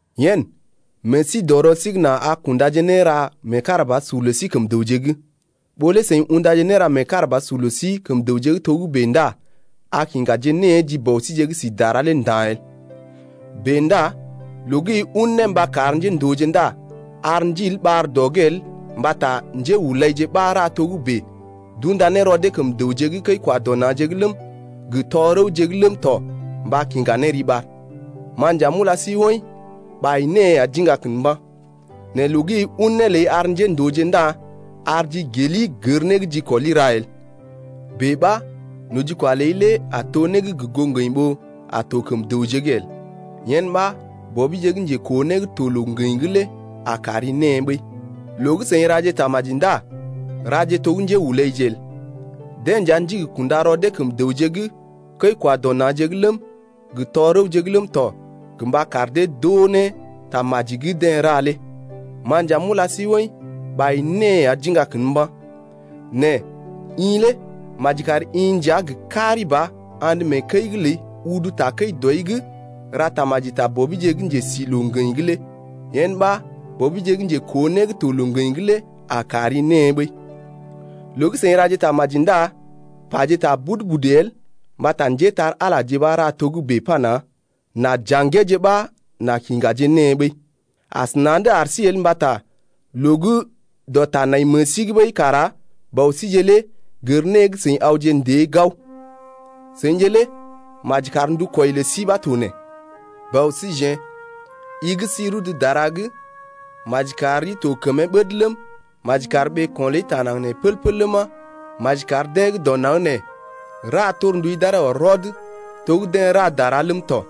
Yen, meḛ sí dɔ rɔ sí’g nà a kundaje néra meekarabasur lə sí kəm dəwje’g. Ɓó lé seḭ undaje néra meekarabasur lə sí kəm dəwje’g togə́bè ndá a kiŋgaje née ji Bɔ síje gə́ si dara lé nda̰ el. Bèe ndá loo gə́ i un né mba kar njéndooje ndá ar ndiil ɓar dɔ’g el mbata njéhulaije ɓa ra togə́bè d’unda ne rɔ dee kəm dəwje kəi-kwa-dɔ-na̰je’g ləm, gə tɔ-rəwje’g ləm tɔ mba kiŋga ne riɓar. Ma nja m’ula sí woḭ, ɓai née ya d’iŋga kən mba̰. Nɛ loo gə́ i un né ləi ar njéndooje ndá ar jigeli gər né gə́ jikɔli ra lé el. Bèe ɓa nojikwa ləi lé a to né gə́ gə goo ŋgəḭ ɓó a to kəm dəwje’g el. Yen ɓa Bɔbije gə́ njekoo né gə́ to loo-ŋgəḭ’g lé a kari née ɓəi. Loo gə́ seḭ raje tamaji ndá raje to gə́ njéhulaije bèe el. Deḛ nja ndigi kunda rɔ dee kəm dəwje’g kəi-kwa-dɔ-na̰je’g ləm, gə tɔ-rəwje ləm tɔ gə mba kar dee d’oo ne tamaji gə́ deḛ ra lé, ma nja m’ula sí woḭ, ɓai née ya d’iŋga kən mba̰. Nɛ i lé maji kari-i nja gə kari ba andə mee kəi’g ləi udu takəi dɔi’g ra tamaji ta Bɔbije gə́ njesi loo-ŋgəḭ’g lé yen ɓa Bɔbije gə́ njekoo né gə́ to loo-ŋgəḭ’g lé a kari née ɓəi. Loo gə́ seḭ raje tamaji ndá paje ta budu-budu el mbata njépole-magəje ɓa ra togə́bè pana: N’a ja̰geeje ɓa n’a kiŋgaje née ɓəi. Asəna̰’d ar sí el mbata loo gə́ dɔ ta nai meḛ sí’g ɓəi kara Bɔ síje lé gər né gə́ seḭ awje ndée gao. Seḭje lé maji kar ndukwɔi lə sí ɓa to nee: Bɔ síjeḛ, i gə́ sí rudu dara’g, Maji kar rii to gə kəmee ɓəd ləm, Maji kar ɓeeko̰ ləi taa naŋg nee pəl-pəl ləma, Maji kar deḛ gə́ dɔ naŋg nee ra torndui d’aree ɔr rɔd to gə́ deḛ ra dara ləm tɔ.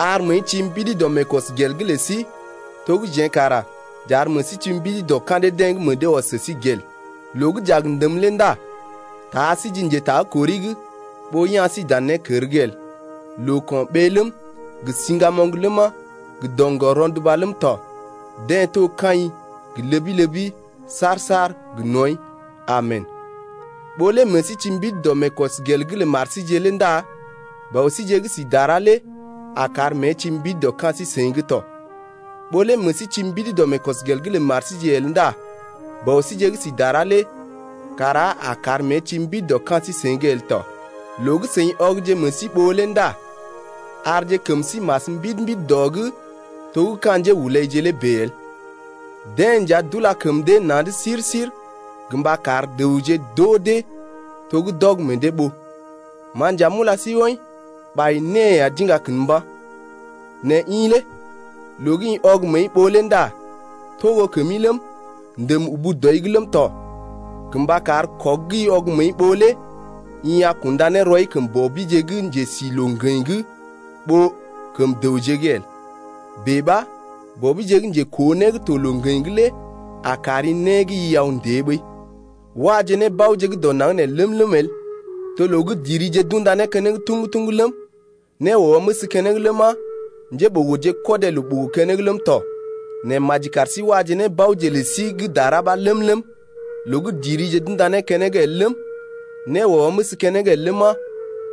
Ar məəi ti mbidi dɔ meekɔsgel’g lə sí To gə́ jeḛ kara j’ar meḛ sí ti mbidi dɔ ka̰ dee-deḛ gə́ meḛ dee ɔs sə sí gel. Loo gə́ j’a gə ndəm lé ndá taa sí ji njekurai’g Ɓó ya̰ sí dan nékər’g el. Loo-ko̰ɓee ləm, gə siŋgamoŋ ləma, gə doŋgɔr rɔnduba ləm tɔ, Deḛ to kaḭ gə ləbi-ləbi saar-saar gə nɔḭ. Amen. Ɓó lé meḛ sí ti mbidi dɔ meekɔsgel’g lə mar síje lé ndá Bɔ síje gə́ si dara lé a kar mée ti mbidi dɔ ka̰ sí-seḭ’g tɔ. Ɓó lé meḛ sí ti mbidi dɔ meekɔsgel’g lə mar síje el ndá Bɔ síje gə́ sí dara lé kara a kar mée ti mbidi dɔ ka̰ sí-seḭ’g el tɔ. Loo gə́ seḭ ɔgje meḛ sí ɓoo lé ndá arje kəm sí mas mbidi-mbidi dɔ’g to gə́ ka̰ njéhulaije lé bèe el. Deḛ nja d’ula kəm dee na̰’d sir-sir gə mba kar dəwje d’oo dee to gə́ d’ɔg meḛ dee ɓoo. Ma nja m’ula sí woḭ, ɓai née ya d’iŋga kən mba̰. Nɛ i lé loo gə́ i ɔg məəi ɓoo lé ndá togo kəmi ləm, ndèm ubu dɔi’g ləm tɔ gə mba kar kɔg gə́ i ɔg məəi ɓoo lé i a kunda ne rɔi kəm Bɔbije gə́ njesi loo-ŋgəḭ’g ɓó kəm dəwje’g el. Bèe ɓa Bɔbije gə́ njekoo né gə́ to loo-ŋgəḭ’g lé a kari né gə́ i aw ndée ɓəi. Waje nébaoje gə́ dɔ naŋg nee ləm-ləm el, to loo gə́ dirije d’unda né keneŋ tuŋgu-tuŋgu ləm, né wɔməs keneŋ ləma, njéɓogoje kɔdé loo ɓogo keneŋ ləm tɔ. Nɛ maji kar sí waje nébaoje lə sí gə́ dara ɓa ləm-ləm, loo gə́ dirije d’unda né keneŋ el ləm, né wɔməs keneŋ el ləma,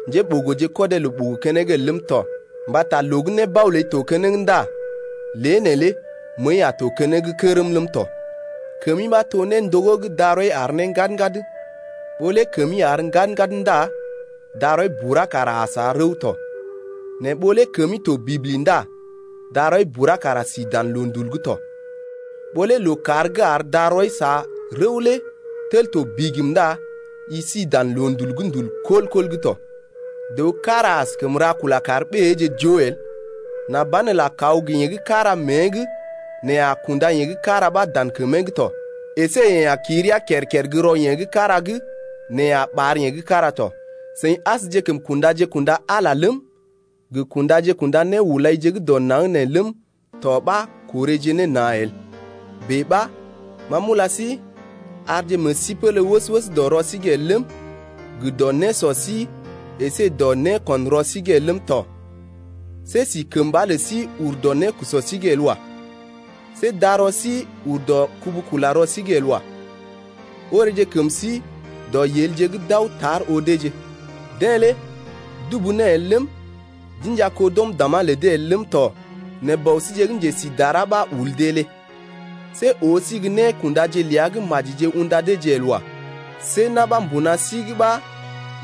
njéɓogoje kɔdé loo ɓogo keneŋ el ləm tɔ. Mbata loo gə́ nébao ləi to keneŋ ndá lée neelé məəi a to gə́ keneŋ kərm tɔ. Kəmi ɓa to néndogó gə́ darɔi àr ne ŋgad-ŋgad, ɓó lé kəmi àr ŋgad-ŋgad ndá darɔi bura kara a sa rəw tɔ. Nɛ ɓó lé kəmi to bibli ndá darɔi bura kara si dan loondul’g tɔ. Ɓó lé lookàr gə́ ar darɔi sa rəw lé tel to bigim ndá i si dan loondul’g gə́ ndul kɔl-kɔl’g tɔ. Dəw kára askəm ra kula kar ɓéeje joo el, nà banelə a kwa gə yeḛ gə́ kára mée’g nɛ a kunda yeḛ gə́ kára ɓa dan kəmee’g tɔ, əsé yeḛ a ki rəa kər-kər gə́ rɔ yeḛ gə́ kára’g nɛ a ɓaar yeḛ gə́ kára tɔ. Seḭ asjekəm kundaje-kunda Ala lé ləm, gə kundaje-kunda néhulaije gə́ dɔ naŋg nee ləm tɔ ɓa korèje ne na̰ el. Bèe ɓa ma m’ula sí, arje meḛ sí pélé wəs-wəs dɔ rɔ sí’g el ləm, gə dɔ nésɔ sí əsé dɔ nékṵ rɔ sí’g el ləm tɔ. See si kəmba lə sí ur dɔ nékusɔ’g el wa. See darɔ sí ur dɔ kubu-kula-rɔ sí’g el wa. Oreeje kəm sí dɔ yelje gə́ d’aw tar oo deeje. Deḛ lé dubu né el ləm, d’inja kó d’ɔm dàmá lə dee el ləm tɔ nɛ Bɔ síje gə́ njesi dara ɓa ul dee lé. See oo sí gə́ nékundaje ləa gə́ majije unda deeje el wa. See na̰ ɓa mbuna sí’g ɓa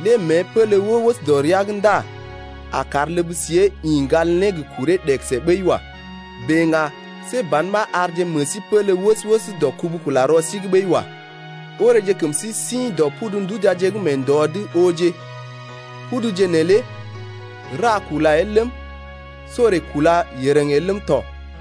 lé mée pélé wəs-wəs dɔ rəa’g ndá a kar ləb siée ḭ ŋgal ne gə kuree ɗegəse ɓəi wa. Bèe ŋga see ban ɓa arje meḛ sí pélé wəs-wəs dɔ kubu-kula-rɔ sí’g ɓəi wa. Oreeje kəm sí sḭ dɔ pudu ndujaje gə́ mee ndɔ’g ooje, puduje neelé ra kula el ləm, sorè kúla yereŋ el ləm tɔ.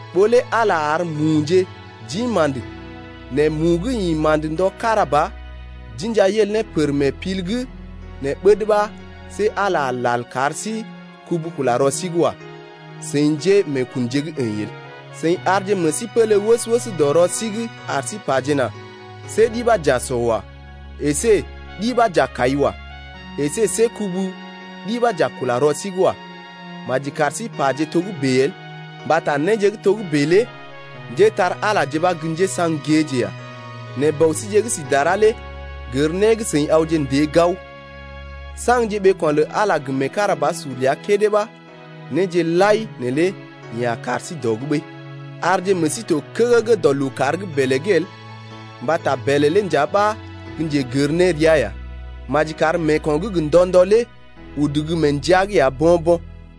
Ɓó lé Ala ar muje d’ḭ ma̰də nɛ mu gə́ ḭ ma̰də ndɔ kára ba d’inja yel ne pər mee pil’g nɛ ɓəd ɓa see Ala a lal kar sí kubu-kula-rɔ sí’g wa, seḭ njémeekunje gə́ əḭ el. Seḭ arje meḛ sí pélé wəs-wəs dɔ rɔ sí’g ar sí pajena: See ɗi ɓa j’a sɔ wa, əsé ɗi ɓa j’a kai wa, əsé see kubu ɗi ɓa j’a kula rɔ sí’g wa, maji kar sí paje togə́bè el. Mbata néje gə́ togə́bè lé njépole-magəje ɓa gə́ njésaŋ géeje ya. Nɛ Bɔ síje gə́ si dara lé gər né gə́ seḭ awje ndée gao. Saŋje ɓeeko̰ lə Ala gə meekarabasur ləa kédé ɓa néje lai neelé yeḛ a kar sí dɔ’g ɓəi. Arje meḛ sí to kəgəgə dɔ lookàr gə́ bèlè’g el mbata bèlè lé nja ɓa gə́ njegər nérea ya. Maji kar meeko̰ gə́ gə ndɔ-ndɔ lé udu gə́ mee ndəa’g ya bo̰-bo̰.